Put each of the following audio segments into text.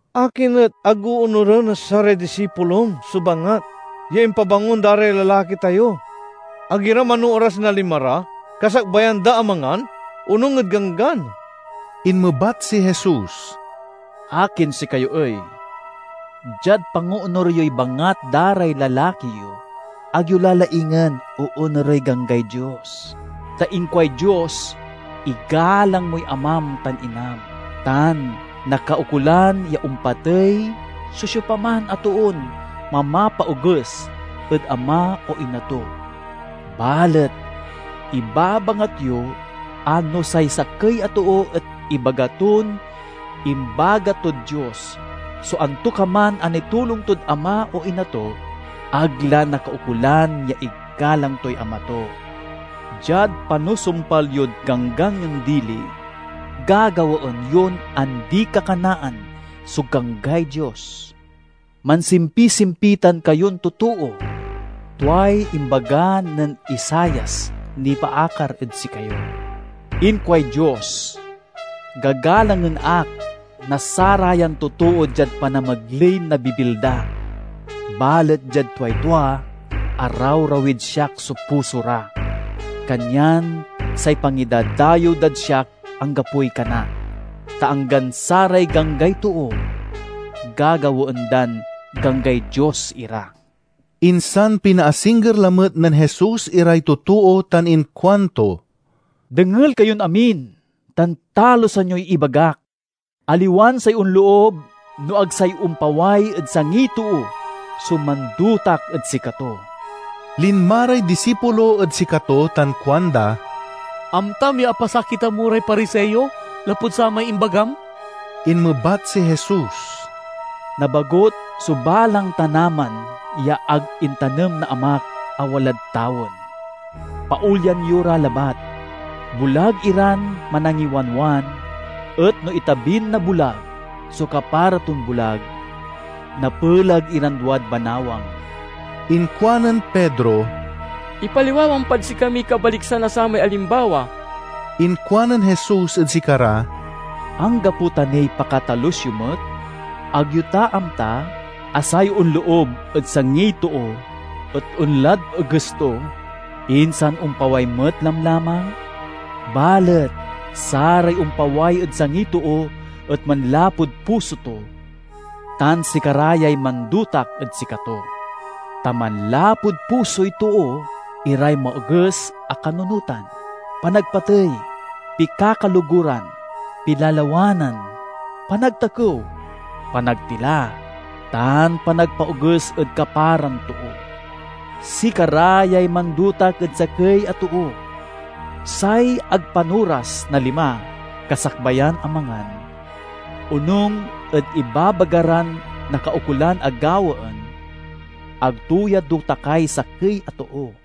"Akin et ag oonuren na saray disipulom so bangat ya impabangon da ray lalaki tayo? Ag ira manooras na lima ra kasakbayan da a mangan, onung ed ganggan!" Inmebat si Jesus, "Akin sikayo ey? Diad pangoonur yoy bangat da ray lalaki yo, ag yo la laingen oonurey ganggay Dios. Ta inkuay Dios, 'Igalang moy amam tan inam,' tan 'Nakaukolan ya ompatey so siopaman a toon mamapaoges ed ama o ina to.' Balet ibabangat yo a no say sakey a too et ibaga ton imbagat tod Dios so antokaman a nitulong tod ama o ina to, ag la nakaukolan ya igalang toy ama to. Diad panusumpal yod ganggan yon dili, gagawaen yon andi-kakanaan so ganggay Dios. Mansimpisimpitan kayon totoo! Tuay imbaga nen Isaias nipaakar ed sikayo: 'Inkuay Dios— Gagalangen ak na sarayan totoo diad panamegley na bibil da; balet diad tuay tua, arawrawid siak so puso ra. Kanyan say pangidadayew dad siak anggapoy kana, ta anggan saray ganggay too gagawaen dan ganggay Dios ira!'" Insan pinaasingger lamet nen Jesus iray totoo tan inkuanto, "Dengel kayon amin tan talusan yoy ibagak! Aliwan say onloob no ag say ompaway ed sangiy too so mandotak ed sikato." Linma ray disipulo ed sikato tan kuanda, "Amtam ya apasakitan mo ray Pariseo lapud samay imbagam?" Inmebat si Jesus, "Nabagut so balang tanaman ya ag intanem na Amak a walad tawen. Paolyan yo ra labat. Bulag iran manangiwanwan; et no itabin na bulag so kapara ton bulag, napelag iran duad banawang." Inkuanen Pedro, "Ipaliwawam pad sikamiy kabaliksan na samay alimbawa." Inkuanen Jesus ed sikara, "Anggapo ta niy pakatalus yo met? Ag yo ta amta a say onloob ed sangiy too et onlad eges to, insan ompaway met lamlamang? Balet saray ompaway ed sangiy too et manlapud puso to, tan sikara yay mandotak ed sikato. Ta manlapud pusoy too iray maoges a kanunotan, panagpatey, pikakaloguran, pilalawanan, panagtakew, panagtila, tan panagpaoges ed kaparan too. Sikara yay mandotak ed sakey a too. Say ag panoras na lima kasakbayan a mangan, onung ed ibabaga ran nakaukolan a gawaen—ag to ya dotakay sakey a too."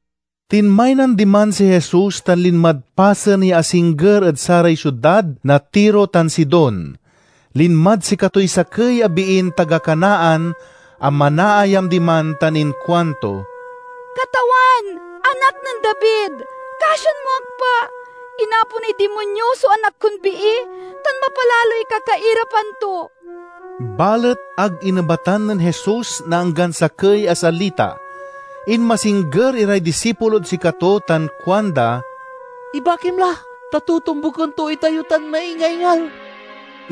Tinmaynan diman si Jesus tan linmad pasen ya asingger ed saray siudad na Tiro tan Sidon. Linmad sikatoy sakey a biin taga Canaan a manaayam diman tan inkuanto, "Katawan, Anak nen David, kasian mo ak pa! Inaponay dimonyo so anak kon bii tan mapalaloy kakairapan to." Balet ag inebatan nen Jesus na anggan sakey a salita. Inmasingger iray disipulod sikato tan kuanda, "Ibakim la, ta totombuken to itayo tan maingaingal."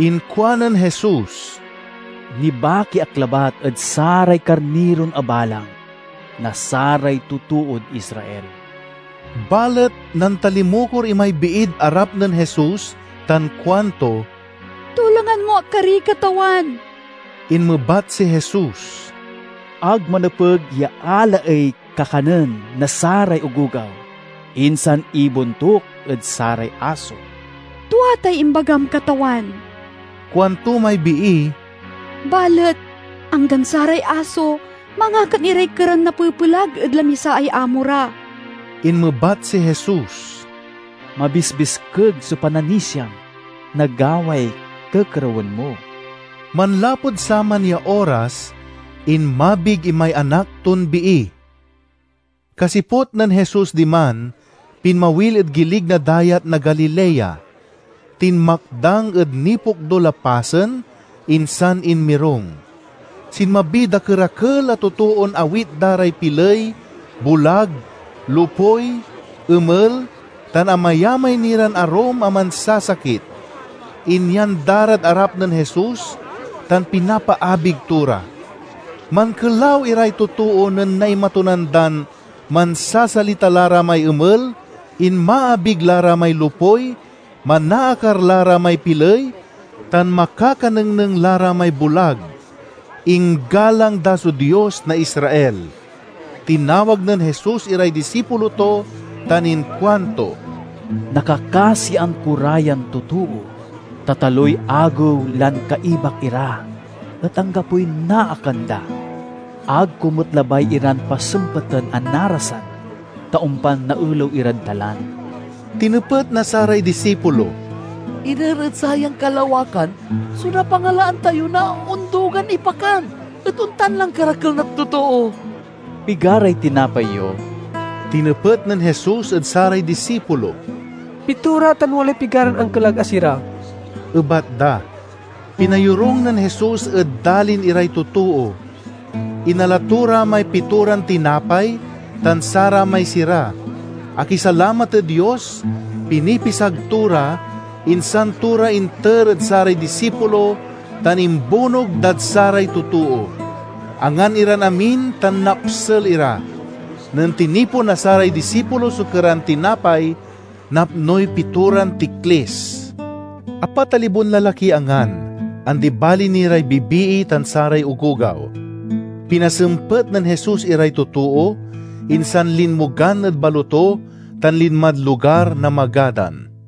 Inkuanen Jesus, "Nibaki ak labat ed saray karniron abalang na saray totood Israel." Balet nantalimukor imay biid arap nen Jesus tan kuanto, "Tulongan mo ak kari, Katawan." Inmebat si Jesus, "Ag manepeg ya alaey kakanen na saray ogogaw, insan ibontuk ed saray aso." "Tua tay imbagam, Katawan," kuanto may bii, "balet anggan saray aso mangakan iray keran napepelag ed lamisaay amo ra." Inmebat si Jesus, "Mabisbiskeg so pananisiam! Nagaway kekerewen mo." Manlapud saman ya oras, inmabig imay anak ton bii. Kasiput nen Jesus diman, pinmawil ed gilig na Dayat na Galilea. Tinmakdang ed nipokdul a pasen, insan inmirung. Sinmabiy dakerakel a totoon awit da ray piley, bulag, lopuy, emel tan amayamay ni ran arum a mansasakit. Inyan da rad arap nen Jesus, tan pinapaabig to ra. Mankelaw iray totoo nen naimatunan dan mansasalita la ra may emel, inmaabig la ra may lopuy, manaakar la ra may piley, tan makakanengneng la ra may bulag. Inggalang da so Dios na Israel. Tinawag nen Jesus iray disipulo to tan inkuanto, "Nakakasian ko ra yan totoo, ta taloy agew lan kaibak ira, et anggapoy naakan da. Ag ko met labay iran pasempeten a narasan, ta ompan naelew irad dalan." Tinepet na saray disipulo, "Iner ed sayan kalawakan so napangalaan tayo na ondugan ipakan ed ontan lan karakel na totoo?" "Pigaray tinapay yo?" tinepet nen Jesus ed saray disipulo. "Pitora, tan walay pigaran ankelag a sira," ebat da. Pinayorung nen Jesus ed dalin iray totoo. Inala to ra may pitoran tinapay tan saramay sira, akisalamat ed Dios, pinipisag to ra, insan to ra inter ed saray disipulo tan imbunog dad saray totoo. Angan iran amin tan napsel ira. Nen tinipon na saray disipulo so keran tinapay, napnoy pitoran tiklis. Apat a libon lalakiy angan, andi bali ni ray bibii tan saray ogogaw. Pinasempet nen Jesus iray totoo, insan linmogan ed baloto tan linmad lugar na Magadan.